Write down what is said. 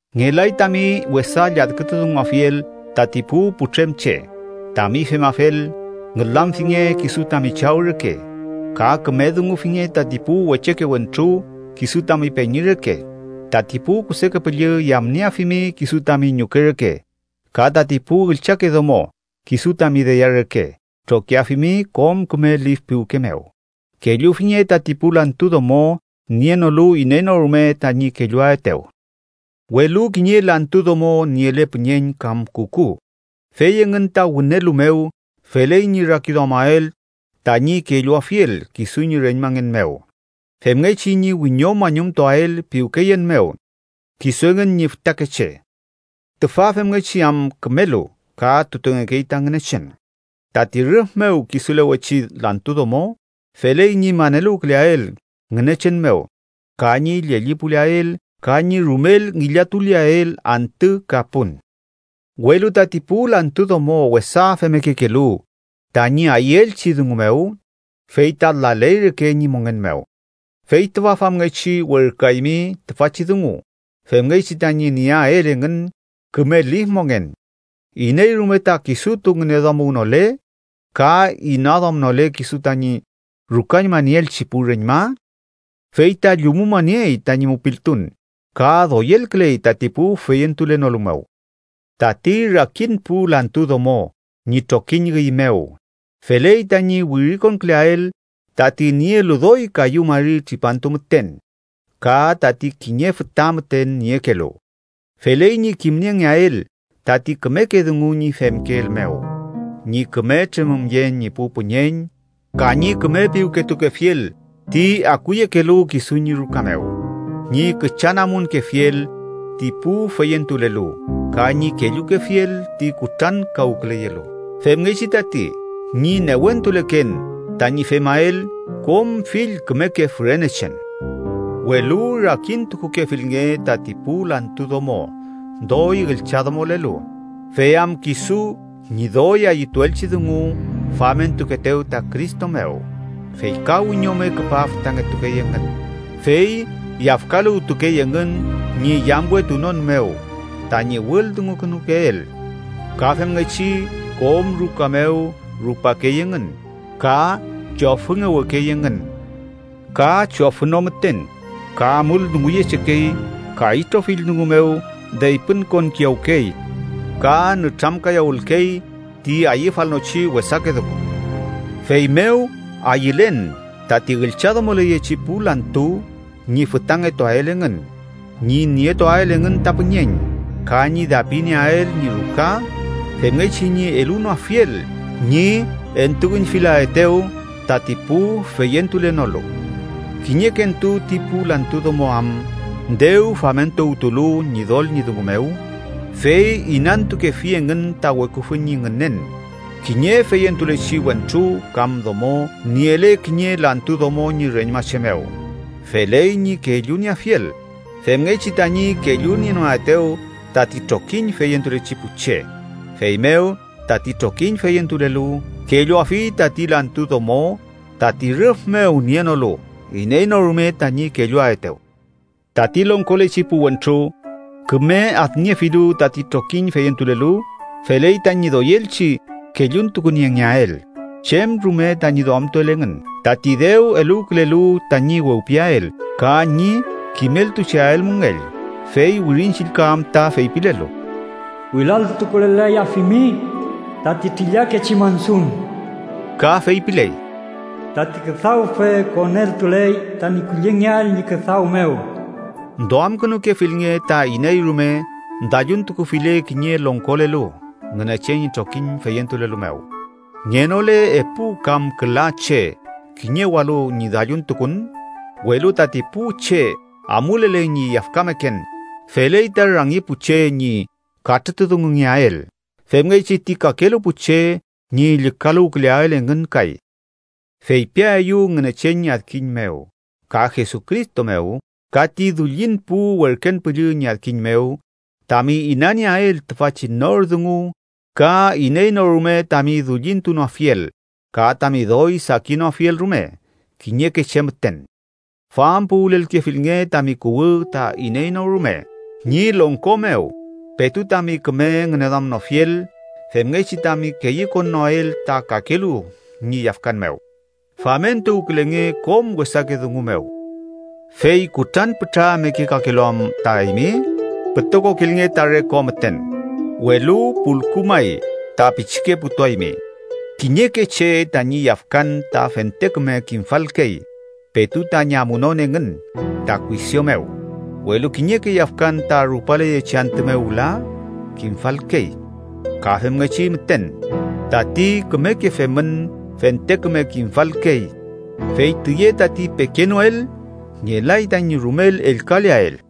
Ngelay tami wesa lladkütudunguafiel tati pu putrem che. Tami femafel, ngülamfinge kisu tami chaw reke. Ka küme dungufinge tati pu wecheke wentru kisu tami peñi reke. Tati pu kuseke püllü yamnieafimi kisu tami ñuke reke. Ka tati pu üllchake domo, kisu tami deya reke trokiafimi kom küme lif piwke mew. Kellufinge tati pu lantu domo nienolu iney no rume tañi kelluaetew. Welu kiñe lantu domo niele püñeñ kam kuku, fey engün ta wünelu mew feley ñi rakiduamael tañi kelluafiel kisu ñi reñmangen mew, femngechi ñi wiñomañumtuael piwkeyen mew kisu engün ñi fütakeche, tüfa femngechi am kümelu ka tutengekey ta Ngünechen. Tati rüf mew kisulewechi lantu domo, feley ñi maneluwküleael Ngünechen mew ka ñi llellipuleael, ka ñi rumel ngillatuleael antü ka pun. Welu tati pu lantu domo wesa femmekekelu tañi ayüelchi dungu mew, fey ta laley reke ñi mongen mew. Fey tüfa famngechi werküaymi tüfachi dungu, femngechi tañi nieael engün küme lif mongen. Iney rume ta kisutu ngüneduamuwnole, ka inaduamnole kisu tañi rukañmanieelchi pu reñma, fey ta llumumaniey tañi mupiltun ka doyelküley tati pu feyentulenolu mew. Tati rakin pu lantu domo ñi trokiñ üy mew feley tañi wirikonküleael tati nielu doy kayu mari tripantu müten ka tati kiñe füta müten niekelu. Feley ñi kimniengeael tati kümeke dungu ñi femkeel mew: ñi küme tremümyen ñi pu püñeñ, ka ñi küme piwketukefiel ti akuyekelu kisu ñi ruka mew, ñi küchanamunkefiel ti pu feyentulelu ka ñi kellukefiel ti kutrankawküleyelu. Femngechi tati, ñi newentuleken tañi femael kom fill kümeke fürenechen. Welu rakin tukukefilnge tati pu lantu domo doy üllchadomolelu, fey am kisu ñi doy ayütuelchi dungu famentukeetew ta Cristo mew, fey ka wiñome küpa fütangetukey engün, fey yafkaluwtukey engün ñi yamwetunon mew tañi wüldungukünukeel. Ka femngechi kom ruka mew rupakey engün, ka chofüngewekey engün. Ka chofü no müten, ka amul dunguyechekey ka itrofill dungu mew deypüntukuwkiyawkey ka nütramkayawülkey ti ayüfalnochi wesake dungu. Feymew ayülen tati üllchadomoleyechi pu lantu ñi fütangetuael engün, ñi nietuael engün ta püñeñ, ka ñi dapinieael ñi ruka femngechi ñi elunoafiel ñi entuüñfilaetew tati pu feyentulenolu. Kiñekentu ti pu lantu domo am dew famentuwtulu Ñidol ñi dungu mew, fey inantukefi engün ta weküfü ñi ngünen. Kiñe feyentulechi wentru kam domo niele kiñe lantu domo ñi reñmache mew, feley ñi kellunieafiel, femngechi tañi kellunienoaetew tati trokiñ feyentulechi pu che. Feymew tati trokiñ feyentulelu kelluafi tati lantu domo tati rüf mew nienolu iney no rume tañi kelluaetew. Tati longkolechi pu wentru, küme adniefilu tati trokiñ feyentulelu, feley tañi doyelchi kelluntukuniengeael chem rume tañi duamtuel engün tati dew eluwkülelu tañi wewpiael ka ñi kimeltucheael müngell. Fey Wirin Chillka am ta feypilelu: “Wilal tukulel-layafimi tati trillakechi mansun”. Ka feypiley: “Tati küdawfe koneltuley tañi kullingeael ñi küdaw mew”. Duamkünukefilnge ta iney rume dalluntukufile kiñe longkolelu Ngünechen ñi trokiñ feyentulelu mew, ngenole epu kam küla che kiñewalu ñi dalluntukun. Welu tati pu che amulele ñi yafkameken, feley ta rangi pu che ñi katrütudungungeael, femngechi ti kakelu pu che ñi llükaluwküleael engün kay. Feypiaeyu Ngünechen ñi adkiñ mew, ka Jesucristo mew ka ti dullin pu werken püllü ñi adkiñ mew, tami inanieael tüfachi nor dungu ka iney no rume tami dullintunoafiel ka tami doy sakinoafiel rume kiñeke che müten. Fampuwülelkefilnge tami kuwü ta iney no rume ñi longko mew petu tami küme ngüneduamnofiel, femngechi tami keyükonnoael ta kakelu ñi yafkan mew. Famentuwkülenge kom wesake dungu mew. Fey kutran pütra mekekakelu am ta eymi, pütokokilnge ta re ko müten, welu pulku may ta pichike putuaymi. Kiñeke che tañi yafkan ta fente küme kimfalkey petu tañi amunon engün ta kuisio mew, welu kiñeke yafkan ta rupaleyechi antü mew wüla kimfalkey. Ka femngechi müten, tati kümeke femün fente küme kimfalkey. Fey tüye tati pekenoel, ngelay tañi rumel ellkaleael.